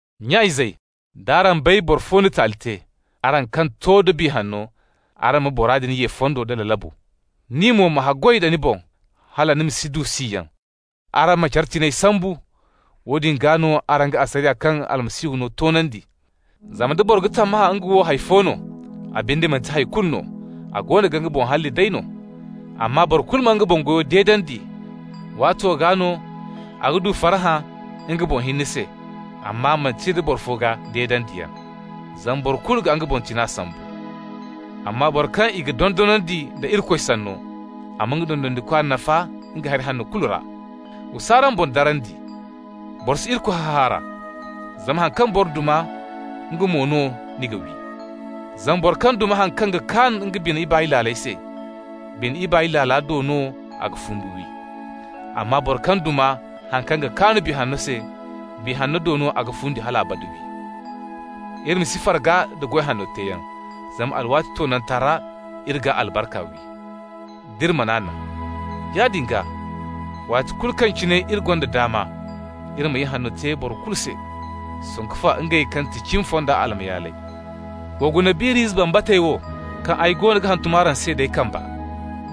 Nya-izey, d'araŋ bay boro fo na taali te, araŋ kaŋ to da Biya Hanno, araŋ ma bora din ye fondo nda lalabu. Ni mo ma haggoy da ni boŋ, hala ni ma si du siyaŋ. Araŋ ma care tiŋay sambu. Woodin gaa no araŋ ga asariya kaŋ Almasihu no toonandi. Zama nda boro ga tammahã nga wo hay fo no, a binde manti hay kulu no, a goono ga nga boŋ halli day no. Amma boro kulu ma nga boŋ goyo deedandi, waato gaa no a ga du farhã nga boŋ hinne se, amma manti nda boro fo gaa deedandiyaŋ. Zama boro kulu ga nga boŋ tiŋa sambu. Amma boro kaŋ i ga dondonandi nda Irikoy Sanno, a ma nga dondonandikwa nafa nga hari hanno kulu ra. Wa s'araŋ boŋ darandi! Boro si Irikoy hahaara. Zama haŋ kaŋ boro duma, nga mo no ni ga wi. Zama boro kaŋ duma haŋ kaŋ ga kaan nga bine ibaay laala se, bine ibaay laala do no a ga fumbi wi. Amma boro kaŋ ga duma haŋ kaŋ ga kaan Biya Hanno se, Biya Hanno do no a ga fundi hal abada wi. Iri ma si farga nda goy hanno teeyaŋ, zama alwaati toonanta ra iri g'a albarka wi, d'iri man'a naŋ. Yaadin gaa, waati kulu kaŋ cine iri gonda daama, iri ma ihanno te boro kulu se, sanku fa ngey kaŋ ga ti cimi fonda almayaaley. Wa guna biir'ize bambatey wo kaŋ ay goono ga hantum araŋ se d'ay kamba.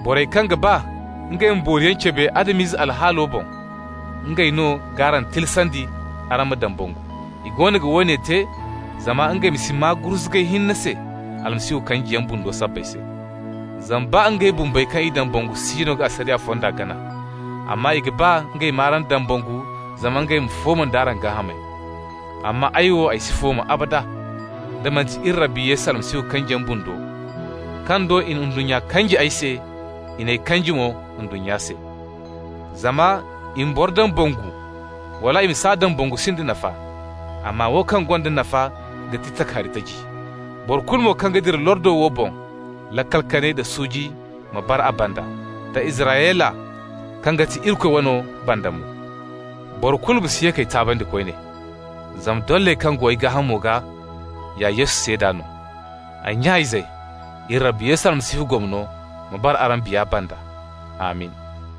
Borey kaŋ ga ba ngey ma booriyaŋ cabe Adam-ize alhaalo boŋ, ngey no g'araŋ tilasandi araŋ ma dambangu. I goono ga woone te zama ngey ma si maa gurzugay hinne se Almasihu kanjiyaŋ bundo sabbay se. Zama baa ngey bumbey kaŋ i dambangu siino ga asariya fonda gana, amma i ga ba ngey m'araŋ dambangu zama ngey ma fooma nd'araŋ gaahamey. Amma ay wo, ay si fooma abada, da manti iri Rabbi Yesu Almasihu kanjiyaŋ bundo kaŋ do i na ndunnya kanji ay se, i n'ay kanji mo ndunnya se. Zama i ma boro dambangu wala i ma s'a dambangu sinda nafa, amma wo kaŋ gonda nafa ga ti takahari taji. Boro kulu mo kaŋ ga dira lordo wo boŋ, laakal kanay da suuji ma bara a banda, da Israyla kaŋ ga ti Irikoy wano banda mo. Boro kulu ma si ye k'ay taabandi koyne, zama dolley kaŋ go ay gaahamo gaa ya Yesu seeda no. Ay nya-izey, iri Rabbi Yesu Almasihu gomno ma bara araŋ biya banda. Amin!